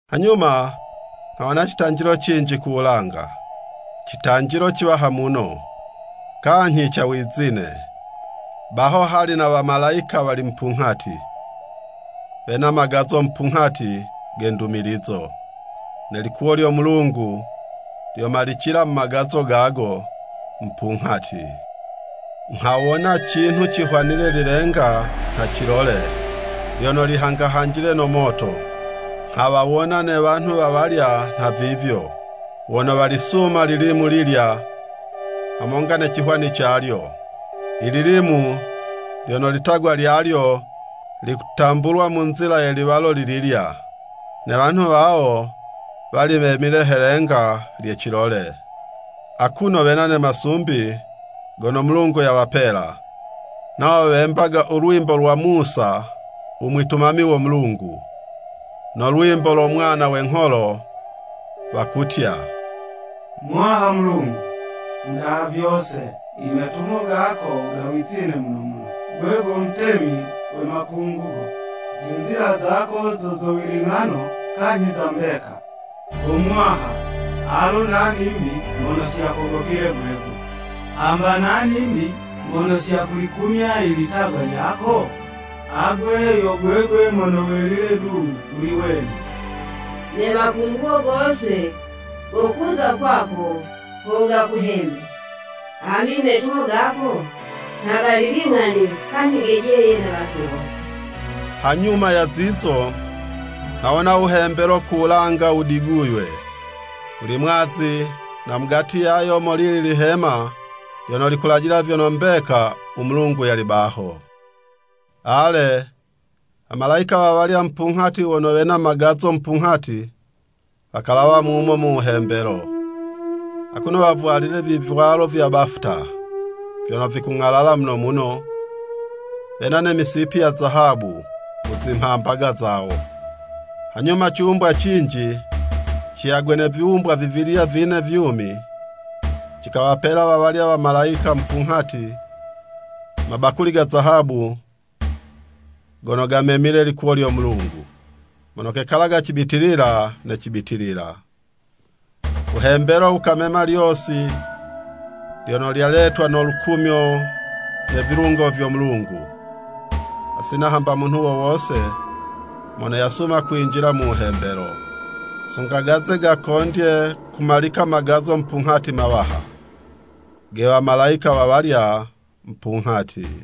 Hanyuma, nghawona citanjilo cinji ku wulanga, citanjilo ciwaha muno, kanyhi ca wizine. Baho hali na wamalayika wali mupunghati, wena magazo mupunghati ge ndumilizo. Ne likuwo lyo Mulungu lyomalicila mu magazo gago mupunghati. Nghawona cinhu cihwanile lilenga nha cilole, lyono lihangahanjile no moto. Nghawawona ne wanhu wa walya nhavivyo, wono walisuma lilimu lilya, hamonga ne cihwani calyo, i lilimu lyono litagwa lyalyo likutambulwa mu nzila ye liwalo lililya. Ne wanhu wawo wali wemile he'lenga lye cilole, akuno wena ne masumbi gono Mulungu yawapela. Nawo wembaga u lwimbo lwa Musa u mwitumami wo Mulungu, no lwimbo lo Mwana we ngholo, wakutya, “Muwaha Mulungu, u Mudaha vyose i metumo gako ga wizine muno muno! Gwe go Mutemi we makungugo, zinzila zako zo zo wiling'ano kanyhi za mbeka! Go Muwaha, alo nani'mbi mono si yakogopile gwegwe? Hamba nani'mbi mono si yakulikumya ilitagwa lyako? Agwe yo gwegwe mono welile du wuli wene. Ne makungugo gose gokuza kwako ho gakuhembe, hambi i metumo gako, nha gali ling'ani kanyhi gejeye ne wanhu wose.” Hanyuma ya zizo, nghawona wuhembelo ku wulanga wudiguywe, wuli mwazi, na mugati yayo, molili lihema lyono likulajila vyono mbeka u Mulungu yali baho. Ale, wamalayika wawalya mupunghati wono wena magazo mupunghati, wakalawa mumo mu wuhembelo, akuno wavwalile vivwalo vya bafuta, vyono vikung'alala muno muno, wena ne misipi ya zahabu mu zimhambaga zawo. Hanyuma ciwumbwa cinji ciyagwe ne viwumbwa vivilya vine vyumi, cikawapela wawalya wamalayika mupunghati, mabakuli ga zahabu gono gamemile likuwo lyo Mulungu, mono kekalaga cibitilila ne cibitilila. U wuhembelo wukamema lyosi lyono lyaletwa no lukumyo ne vilungo vyo Mulungu, hasina hamba munhu wo wose mono yasuma kwinjila mu wuhembelo, sunga gaze gakondye kumalika magazo mupunghati mawaha, ge wamalayika wawalya mupunghati.